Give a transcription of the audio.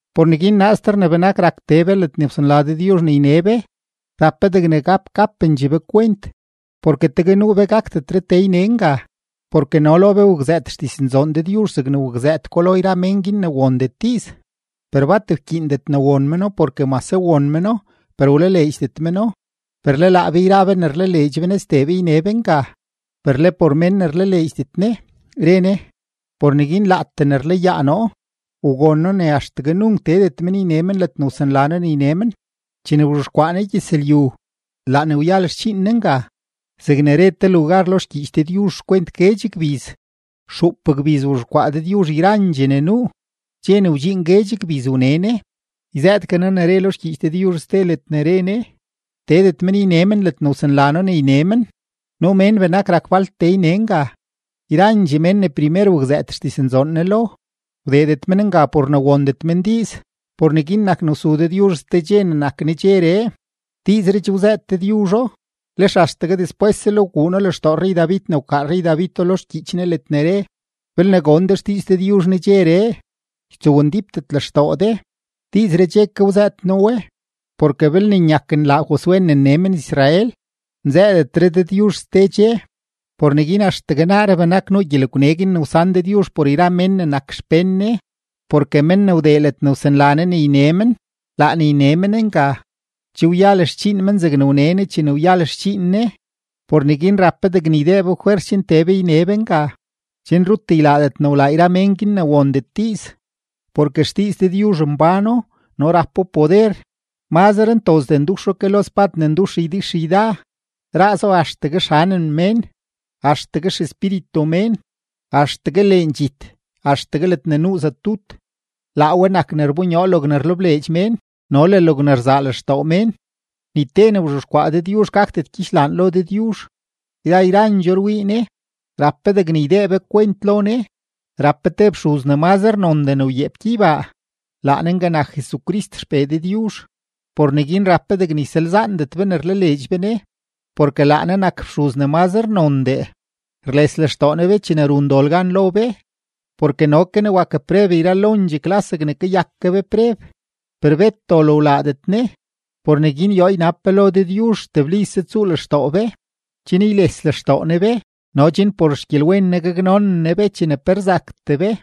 Por neguin naaster ne benakre rak tee be ledne wsanla Dëdyuzh ne yne be, rap be degne gap gapendxee be kwent, porke tegue nuu be gakdetre tee yne nga. Porke no lo be wakzëët xdiznzoon Dëdyuzh zegne wakzëët ko lo yra mén guin ne wondet diiz; per bat wkyiindet ne won meno porke mase won meno, per wlaleedxdet meno. Per le laa be yra be ne rlaleedx be Ne, sdee be yne be nga. Per le por mén ne rlaleedxdet Ne, re Ne: Por neguin laatee ne rlayaa noo, wgon noo ne axtegue nunk teedet men yne men ledne wsanla noo ne yne men. Chene wzhexkwaa Ne gyëzlyu, laa ne wyal xdxiin Ne nga, zegne re te lugar lo xgyiich Dëdyuzh xkwent guedx gbiz: Xuup gbiz wzhexkwaa Dëdyuzh yrandxee ne nuu, dxe ne wdxiin guedx gbiz wne Ne. Yzëëtgue noo ne re lo xgyiich Dëdyuzh ste ledne re Ne: Teedet men yne men ledne wsanla noo ne yne men. Nuu mén benak rak falt tee yne nga; yrandxee mén ne primer wakzëët xdiznzoon Ne lo, wdeedet men nga por ne wondet men diiz. Por neguin nak ne wsu Dëdyuzh ste dxe ne nak “nedxeree”. Diizree che wzëët Dëdyuzho, lex axtegue despweslel wguu No lextoo rrey-David ne wkaa rrey-Davido lo xgyiich Ne ledne re: Belne gon de xdiiz Dëdyuzh nedxeree, ytsowndípdet lextoo de. Diizree che ke wzëët noo we. Porke belne nyak nlaa Josué ne nne men-Israel, nzëëdetre Dëdyuzh ste dxe. Por neguin axtegue naaree benak nuu gyelegwne guin ne wsan Dëdyuzh por yra mén ne nak xpén Ne. Porke men ne wdee ledne wsanla Ne ne yne men, laa ne yne men nga, che wyal xdxiin men, zegne wne Ne chene wyal xdxiin Ne. Por neguin rap be degne ydee be fwers chen tee be yne be nga, chen rut ylaadet ne wlaa yra mén guin ne wondet diiz. Porke xdiiz Dëdyuzh mbáno no rapo poder, mazre ntozdee nduxo ke lo spad ne ndux ydixyda, raazo axtegue xanem mén, axtegue xespíritu mén, axtegue leen dxit, axtegue ledne nuu zatut; laa we nak ne rbonyoo logne rlebleedx mén no le logne rzaa lextoo mén. Ni te ne wzhexkwaa Dëdyuzh gakdet ygyidxlaan lo Dëdyuzh, yra yrandxoo rwii Ne; rap be degne ydee be kwent lo Ne. Rap be te fxuz ne mazre nondee ne wyeep gyeybaa, laa Ne nga nak Jesucrist XPee Dëdyuzh. Por neguin rap be degne ysalzaandet be ne rlaleedx be Ne. Porke laa Ne nak fxuz ne mazre nondee, rles lextoo Ne be chene run dol gan lo be, porke no ke Ne wak preb yralondxee klas zegne kayak ke be preb. Per bet dol wlaadet Ne. Por neguin yoo ynab be lo Dëdyuzh teblise tsuu lextoo be, chen yles lextoo Ne be no chen por xgyelwen Ne gaknonen Ne be chene pe rzaktee be.